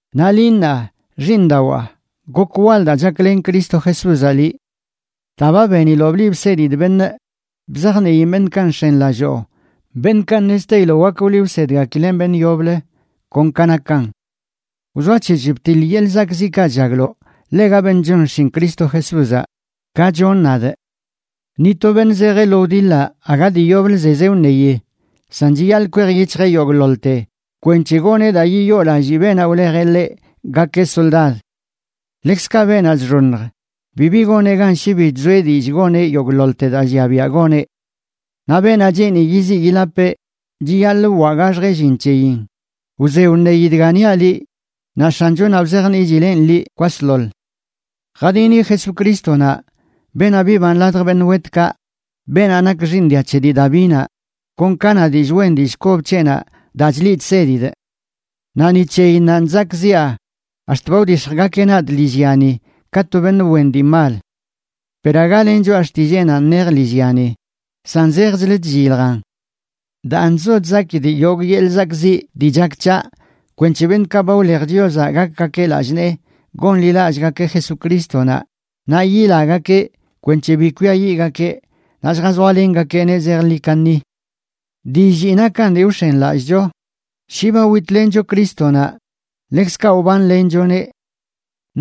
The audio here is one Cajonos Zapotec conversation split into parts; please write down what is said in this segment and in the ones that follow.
Naꞌ liꞌ, ṉaa, xiiṉdawaa, gok wal daa chaklen Cristo Jesúzaꞌ liꞌ. Daa ba beniloꞌ bliꞌ bsedidꞌ beṉꞌ, bzajniin beṉꞌkaꞌ nx̱enlalloo, beṉꞌkaꞌ ṉezteiloꞌ wak wliꞌ wsedgakileꞌn beṉꞌ yoblə kon ka nakan. Wzoac̱hec̱h btiḻ yeḻꞌ zakꞌziꞌkaꞌ chllagloꞌ ḻega beṉꞌ chon xshin Cristo Jesúzaꞌ, ka chonꞌ nadꞌ. Ni to beṉꞌ zejeꞌ lo wdiḻaꞌ aga dii yoblə zezeꞌ wṉeyi, san chiyaḻꞌ kwej yic̱hjeꞌ yogꞌḻoḻte kwenc̱he goneꞌ daa yiyoolallii beenaꞌ wlejeꞌ ḻeꞌ gakeꞌ soldad. Ḻekzkaꞌ beenaꞌ chxoṉj, bibi goneꞌ gan shi bi chzoeꞌ dillꞌ goneꞌ yogꞌḻoḻte daa llia biaꞌ goneꞌ. Naꞌ beenaꞌ cheeni yiziꞌ yilapeꞌ chiyaḻꞌ wwaꞌgaxjeꞌ llin c̱heyin. Wze wṉeyi dga niaꞌ liꞌ, naꞌ X̱anchonaꞌ wzajniꞌchileꞌn liꞌ kwasḻoḻ. Jadini Jesucrístonaꞌ, beenaꞌ biban ladj beṉꞌ wetkaꞌ, beenaꞌ nak xiiṉ dia c̱he dii Davinaꞌ, kon ka na dillꞌ wen dillꞌ kob c̱heꞌnaꞌ daa chliꞌ chsedidꞌ. Naꞌ ni c̱heyinnanꞌ chzakꞌziꞌa, ax̱t ba wdix̱jgakeꞌ nadꞌ lillyani ka to beṉꞌ wen dii mal. Per aga len choꞌa xtilleenanꞌ nej lillyani, san zejchlə chlliljan. Daan chzo chzakidꞌ yogꞌ yeḻꞌ zakꞌziꞌ dii chak c̱haꞌ, kwenc̱he beṉꞌkaꞌ ba wlej Chiozaꞌ gakgakeꞌ lallꞌ nee gonḻilallꞌgakeꞌ Jesucrístonaꞌ naꞌ yilagakeꞌ kwenc̱he bi kwiayiꞌgakeꞌ, naꞌ lljazoalengakeꞌneꞌ zejḻi kaṉi. Dillii nakan dii wx̱enlallꞌcho: Shi ba witlencho Crístonaꞌ, ḻekzkaꞌ wbanlenchoneꞌ.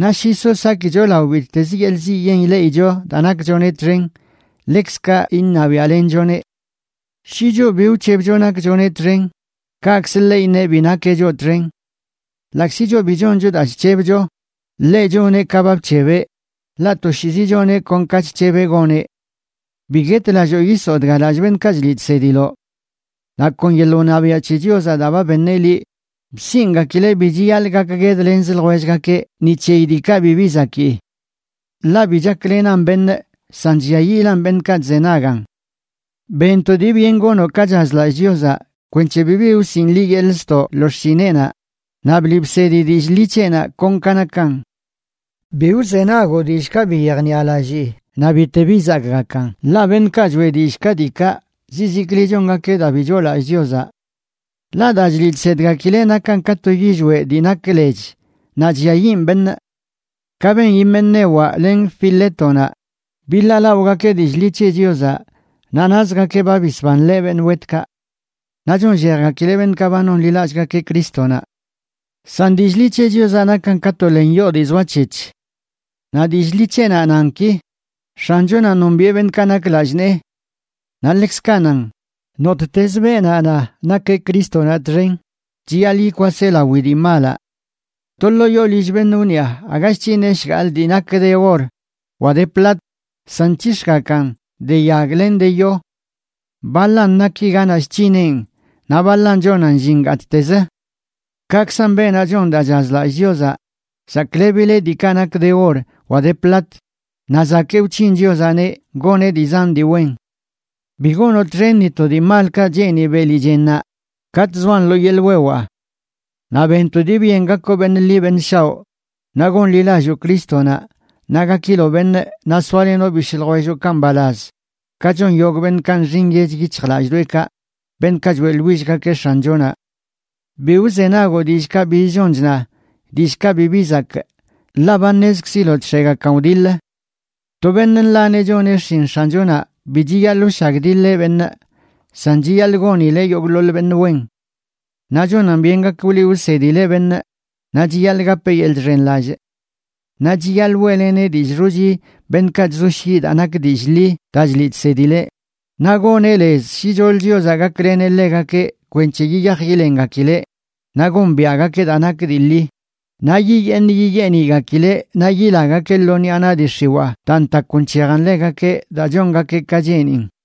Naꞌ shi so sakicho lao bittezə yeḻꞌ ziꞌ yen ileꞌicho daa nakchoneꞌ txen, ḻekzkaꞌ iṉabiaꞌlenchoneꞌ. Shi choꞌ bi wc̱hebcho nakchoneꞌ txen, kaꞌkzə ḻeꞌ iṉeꞌ bi nakeꞌ choꞌ txen. Ḻaꞌkzi choꞌ bi choncho daa chc̱hebcho, ḻeꞌ choneꞌ ka ba bc̱hebeꞌ, ḻaꞌ toshiizi choneꞌ kon ka chc̱hebeꞌ goneꞌ. Bi guetlalloo yisoo dga lallꞌ beṉꞌkaꞌ chliꞌ chsediloꞌ. Naꞌ kon yeḻꞌ wṉabiaꞌ c̱he Chiozaꞌ daa ba beṉeꞌ liꞌ bsiꞌngakileꞌ bi chiyaḻꞌ gakguedlenzə ljwellgakeꞌ ni c̱heyi diikaꞌ bibi zakii. Ḻaꞌ bi chaklenan beṉꞌ, san chlliayiꞌlan beṉꞌkaꞌ chzenagan. Ben to dii byen gonoꞌ ka chazlallꞌ Chiozaꞌ kwenc̱he bibi wsiꞌn liꞌ yeḻꞌ ztoꞌ lo xshineꞌnaꞌ, naꞌ bliꞌ bsedi dillꞌ ḻi c̱heꞌnaꞌ kon ka nakan. Bi wzenagoꞌ dillꞌkaꞌ bi yejniꞌalallii naꞌ bite bi zakgakan, ḻaꞌ beṉꞌkaꞌ choeꞌ dillꞌ ka diikaꞌ zizikli chongakeꞌ daa bi choolallꞌ Chiozaꞌ. Ḻaꞌ daa chliꞌ chsedgakileꞌ nakan ka to yillweꞌ dii nak lech naꞌ chlliayiꞌn beṉꞌ. Kaꞌ ben Himenewaꞌ len Filétonaꞌ, biḻaalaꞌogakeꞌ dillꞌ ḻi c̱he Chiozaꞌ naꞌ nazgakeꞌ ba bisbanleꞌ beṉꞌ wetkaꞌ. Naꞌ chonllejgakileꞌ beṉꞌkaꞌ ba nonḻilallꞌgakeꞌ Crístonaꞌ. San dillꞌ ḻi c̱he Chiozaꞌ nakan ka to len yoo dii zoac̱hec̱h. Naꞌ dillꞌ ḻi c̱heꞌnaꞌ nan ki: “X̱anchonaꞌ nombiꞌe beṉꞌkaꞌ nak lallꞌ nee.” Naꞌ ḻekzkaꞌ nan: “Nottezə beenaꞌ na nakeꞌ Crístonaꞌ txen, chiyaḻꞌ yikwaseꞌ lawi dii malaꞌ.” To ḻoo yoo lill beṉꞌ wniꞌa aga chc̱hineꞌ shgaḻꞌ dii nak de or wa de plat, san nc̱hix̱gakan de yag len de yo. Baḻan naki ganaꞌ chc̱hineꞌn, naꞌ baḻan chonan llin gattez. Kaꞌkzan beenaꞌ chon daa chazlallꞌ Chiozaꞌ, saklebileꞌ diikaꞌ nak de or wa de plat, naꞌ zakee wc̱hin Chiozaꞌneꞌ goneꞌ dii zan dii wen. Bi gonoꞌ txen ni to dii malkaꞌ cheeni beli chennaꞌ katꞌ zoan lo yeḻꞌ wewaa. Naꞌ ben to dii byen gakoꞌ beṉꞌ ḻi beṉꞌ shaoꞌ, naꞌ gonḻilalloo Crístonaꞌ, naꞌ gakiloꞌ beṉꞌ, naꞌ soalenoꞌ bishꞌ ljwelloꞌkaꞌ mbalaz, ka chon yogꞌ beṉꞌkaꞌ nxi nyech yic̱hjlalldoeꞌkaꞌ, beṉꞌkaꞌ choeꞌḻwillgakeꞌ X̱anchonaꞌ. Bi wzenagoꞌ dillꞌkaꞌ biz chon chna, dillꞌkaꞌ bibi zakꞌ, ḻaꞌ ba ṉezkziloꞌ chx̱egakan wdiḻ. To beṉꞌ nḻaneꞌ choneꞌ xshin X̱anchonaꞌ bi chiyaḻꞌ wshagdiḻeꞌ beṉꞌ, san chiyaḻꞌ gonileꞌ yogꞌḻoḻ beṉꞌ wen. Naꞌ chonan byen gak wliꞌ wsedileꞌ beṉꞌ, naꞌ chiyaḻꞌ gapeꞌ yeḻꞌ chxenlallꞌ. Naꞌ chiyaḻꞌ weꞌleneꞌ dillꞌ xochi beṉꞌkaꞌ chzoshyiꞌ daa nak dillꞌ ḻi daa chliꞌ chsedileꞌ, naꞌ goneꞌ lez shicholə Chiozaꞌ gakleneꞌ ḻegakeꞌ kwenc̱he yiyaj yilengakileꞌ naꞌ gombiaꞌgakeꞌ daa nak dii ḻi, naꞌ yiyeeṉ yiyeeṉigakileꞌ naꞌ yilagakeꞌ lo ṉiꞌa naꞌ dii x̱iwaa daa ntakw nc̱hejan ḻegakeꞌ daa chongakeꞌ ka cheenin.